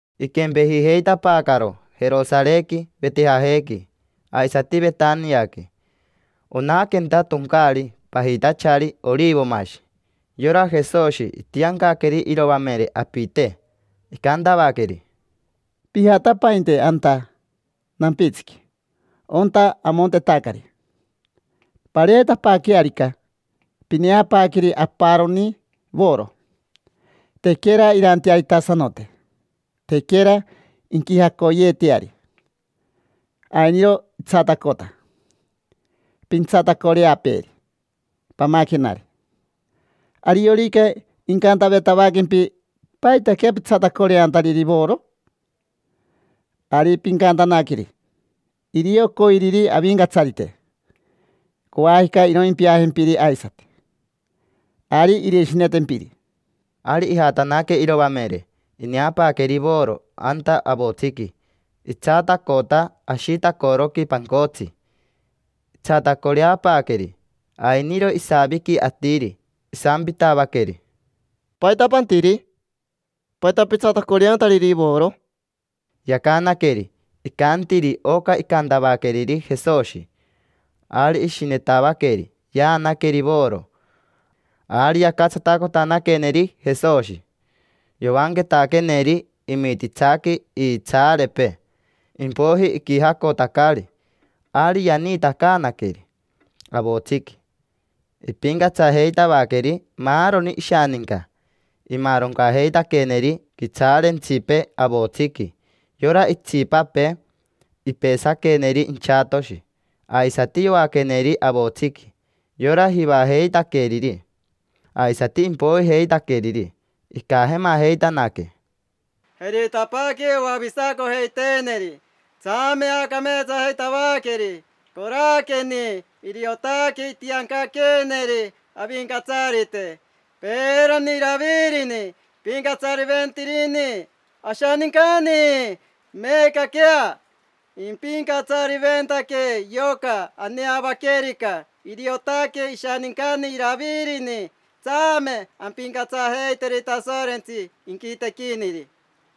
Iquempejijeitapaacaro Jerosarequi, Vetejajequi, aisati Vetaniaqui: onaquenta toncaari pajitachari Orivomashi. Yora Jesoshi itiancaqueri iroamere apite, icantavaqueri: —Pijatapainte anta nampitsiqui onta amontetacari. Pareetapaaquearica, pineapaaqueri aparoni voro, tequera irantearitasanote, tequera inquijacoyeeteari. Ainiro itsatacota: pintsatacoreapeeri, pamaquenari. Ariorica incanteetavaquempi: “¿Paitaquea pitsatacoreantariri voro?” Ari pincantanaqueri: “Irio coiriri Avincatsarite. Coajica iroimpiajempiri aisati”. Ari irishinetempiri. Ari ijatanaque iroamere. Ineapaaqueri voro anta avotsiqui. Itsatacota ashitacoroqui pancotsi. Itsatacoreapaaqueri. Ainiro isaviqui atiri, isampitavaqueri: —¿Paita pantiri? ¿Paita pitsatacoreantariri voro? Yacanaqueri, icantiri oca icantavaqueriri Jesoshi. Ari ishinetavaqueri yaanaqueri voro. Ari yacatsatacotanaqueneri Jesoshi. Yoanquetaqueneri imititsaqui iitsaarepee, impoiji iquijacotacari. Ari yaniitacaanaqueri avotsiqui, ipincatsajeitavaqueri maaroni ishaninca, imaaroncajeitaqueneri quitsaarentsipee avotsiqui. Yora itsipapee ipesaqueneri inchatoshi, aisati yoaqueneri avotsiqui. Yora jivajeitaqueriri aisati impoijeitaqueriri, icajemajeitanaque: —Jeritapaaque oavisacojeiteeneri, tsame aacameetsajeitavaqueri. Coraqueni, iriotaque itiancaqueeneri Avincatsarite. Peerani Iravirini ipincatsariventirini ashanincani: meecaquea, impincatsariventaquee yoca aneavaquerica. Iriotaque ishanincani Iravirini. Tsame ampincatsajeiteri Tasorentsi inquitequiniri.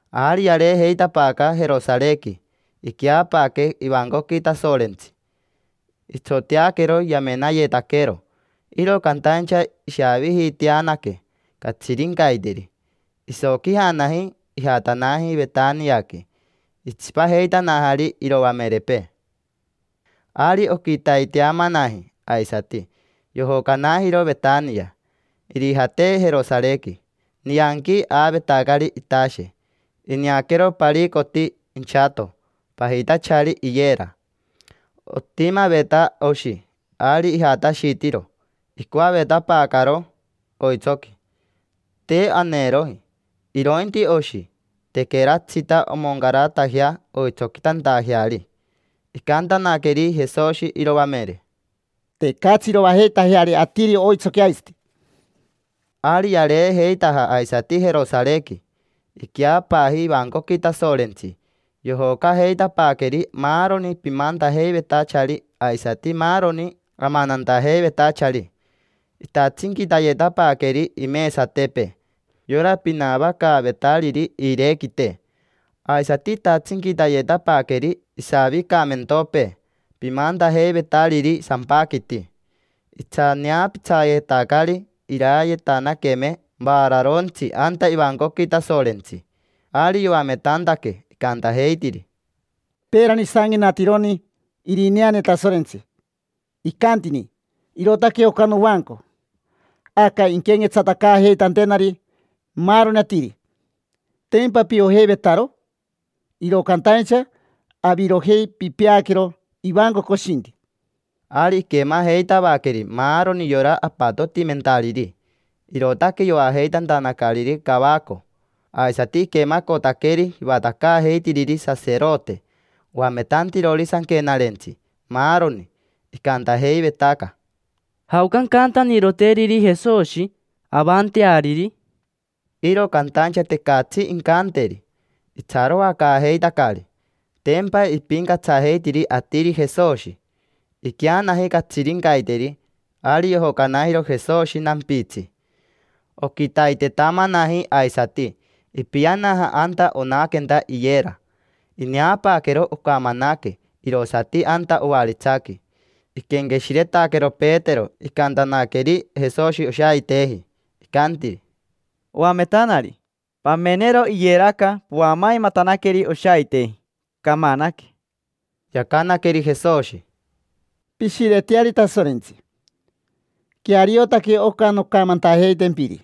Ari yareejeitapaaca Jerosarequi, iqueapaaque ivancoqui Tasorentsi. Itsoteaquero yamenayetaquero, iro cantaincha ishaavijiiteanaque catsirincaiteri. Isoquijanaji, ijatanaji Vetaniaqui. Itsipajeitanajari iroamerepee. Ari oquitaitetamanaji aisati, yojocanajiro Vetania, irijate Jerosarequi. Nianqui aavetacari itashe. Ineaquero paricoti inchato, pajitachari iyera. Otimaveta oshi. Ari ijatashitiro, icoavetapaacaro oitsoqui. Te aneeroji, irointi oshi. Tequeratsita omoncaratajea oitsoquitantajeari. Icantanaqueri Jesoshi iroamere: —Tecatsi iroajeitajeari atiri oitsoqui aisati. Ari yareejeitaja aisati Jerosarequi. Iqueapaaji ivancoqui Tasorentsi. Yojocajeitapaaqueri maaroni pimantajeivetachari aisati maaroni amanantajeivetachari. Itatsinquitayetapaaqueri imesatepee yora pinavacaavetariri iirequite. Aisati itatsinquitayetapaaqueri isavicamentopee pimantajeivetariri sampaquiti. Itsaneapitsajeitacari irayetanaqueme vaararontsi anta ivancoqui Tasorentsi. Ari yoametantaque, icantajeitiri: —Peerani isanquenatironi irineane Tasorentsi, icantini: “Irootaque oca novanco. Aca inquenquetsatacaajeitantenari maaroni atiri”. Tempa piojeivetaro. Iro cantaincha avirojei pipeaquero ivanco coshinti. Ari iquemajeitavaqueri maaroni yora apatotimentariri, irootaque yoajeitantanacariri cavaco. Aisati iquemacotaqueri jivatacaajeitiriri saserote, oametantirori sanquenarentsi, maaroni. Icantajeivetaca: —¿Jaoca ancantaniroteriri Jesoshi, avanteariri? Iro cantaincha tecatsi incanteri, itsaroacaajeitacari. Tempa ipincatsajeitiri atiri Jesoshi. Iqueanaji catsirincaiteri, ari yojocanajiro Jesoshi nampitsi. Oquitaitetamanaji aisati, ipianaja anta onaquenta iyera. Ineapaaquero, ocamanaque, irosati anta ovaritsaqui. Iquenqueshiretaquero Petero icantanaqueri Jesoshi oshaiteji. Icantiri: —Oametanari, pamenero iyeraca poamaimatanaqueri oshaiteji. Camanaque. Yacanaqueri Jesoshi: —Pishireteari Tasorentsi. Queariotaque oca noncamantajeitempiri.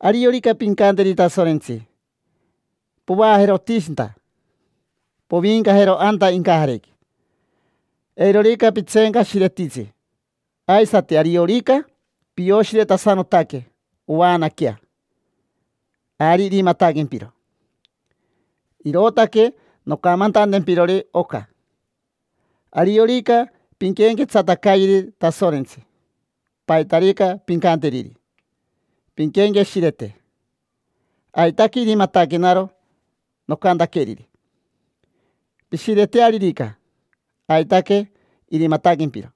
Ariorica pincanteri Tasorentsi: “Povaajero otishinta, poviincajero anta incajarequi”. Eirorica pitseencashiretitsi, aisati ariorica pioshiretasanotaque ovaanaquea, ari irimataquempiro. Irootaque noncamantantempirori oca: ariorica pinquenquetsatacayeri Tasorentsi, paitarica pincanteriri, pinquenqueshirete: “Aitaque irimataquenaro nocantaqueriri”. Pishiretearirica, aitaque irimataquempiro.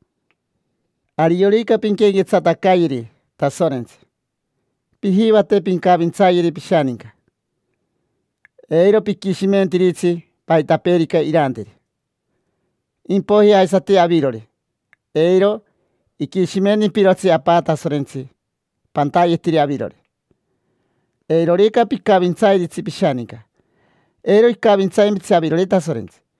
Ariorica pinquenquetsatacayeri Tasorentsi, pijivate pincavintsayeri pishaninca: eiro piquishimentiritsi paitapeerica iranteri. Impoiji aisati avirori, eiro iquishimentimpirotsi Apa Tasorentsi pantayetiri avirori. Eirorica picavintsairitsi pishaninca, eiro icavintsaimpitsi avirori Tasorentsi.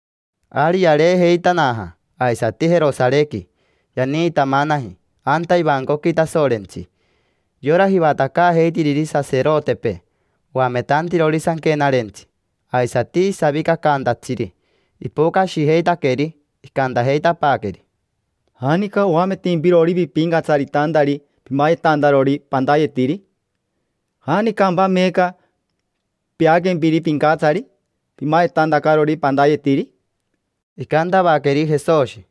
Ari yareejeitanaja aisati Jerosarequi, yaniitamanaji anta ivancoqui Tasorentsi. Yora jivatacaajeitiriri saserotepee, oametantirori sanquenarentsi, aisati savicacaantatsiri ipocashijeitaqueri. Icantajeitapaaqueri: —¿Janica oametimpirori pipincatsaritantari pimayetantarori pantayetiri? ¿Janicampa meeca peaquempiri pincatsari, pimayetantacarori pantayetiri? Icantavaqueri Jesoshi: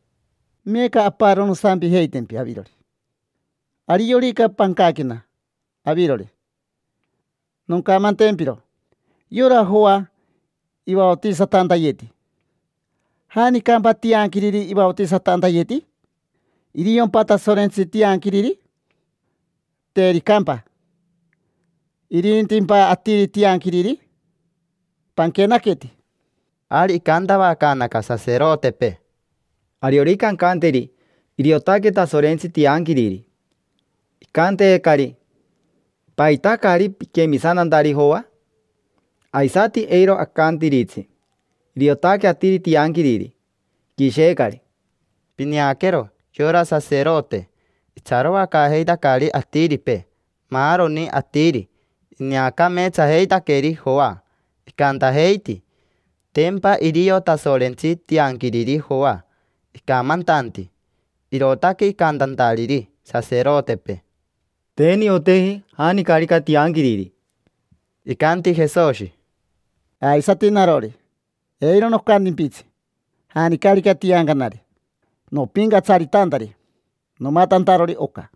—Meeca aparo nosampijeitempi avirori. Ariorica pancaquena avirori, noncamantempiro. Yora Joa ivaotisatantayeti. ¿Janicampa tianquiriri ivaotisatantayeti? ¿Iriompa Tasorentsi tianquiriri? Tericampa, ¿irintimpa atiri tianquiriri? Panquenaqueti. Ari icantavacaanaca saserotepee: —Ariorica ancanteri: “Iriotaque Tasorentsi tianquiriri”, icanteecari: “¿Paita caari piquemisantantari Joa?” Aisati eiro acantiritsi: “Iriotaque atiri tianquiriri”. Iquisheecari. Pineaquero, yora saserote itsaroacaajeitacari atiripee; maaroni atiri ineacameetsajeitaqueri Joa, icantajeiti: “Tempa irio Tasorentsi tianquiriri Joa icamantanti”. Irootaque icantantariri saserotepee: —Te nioteji janicarica tianquiriri. Icanti Jesoshi: —Aisati narori, eiro nocantimpitsi janicarica tiancanari nopincatsaritantari nomatantarori oca.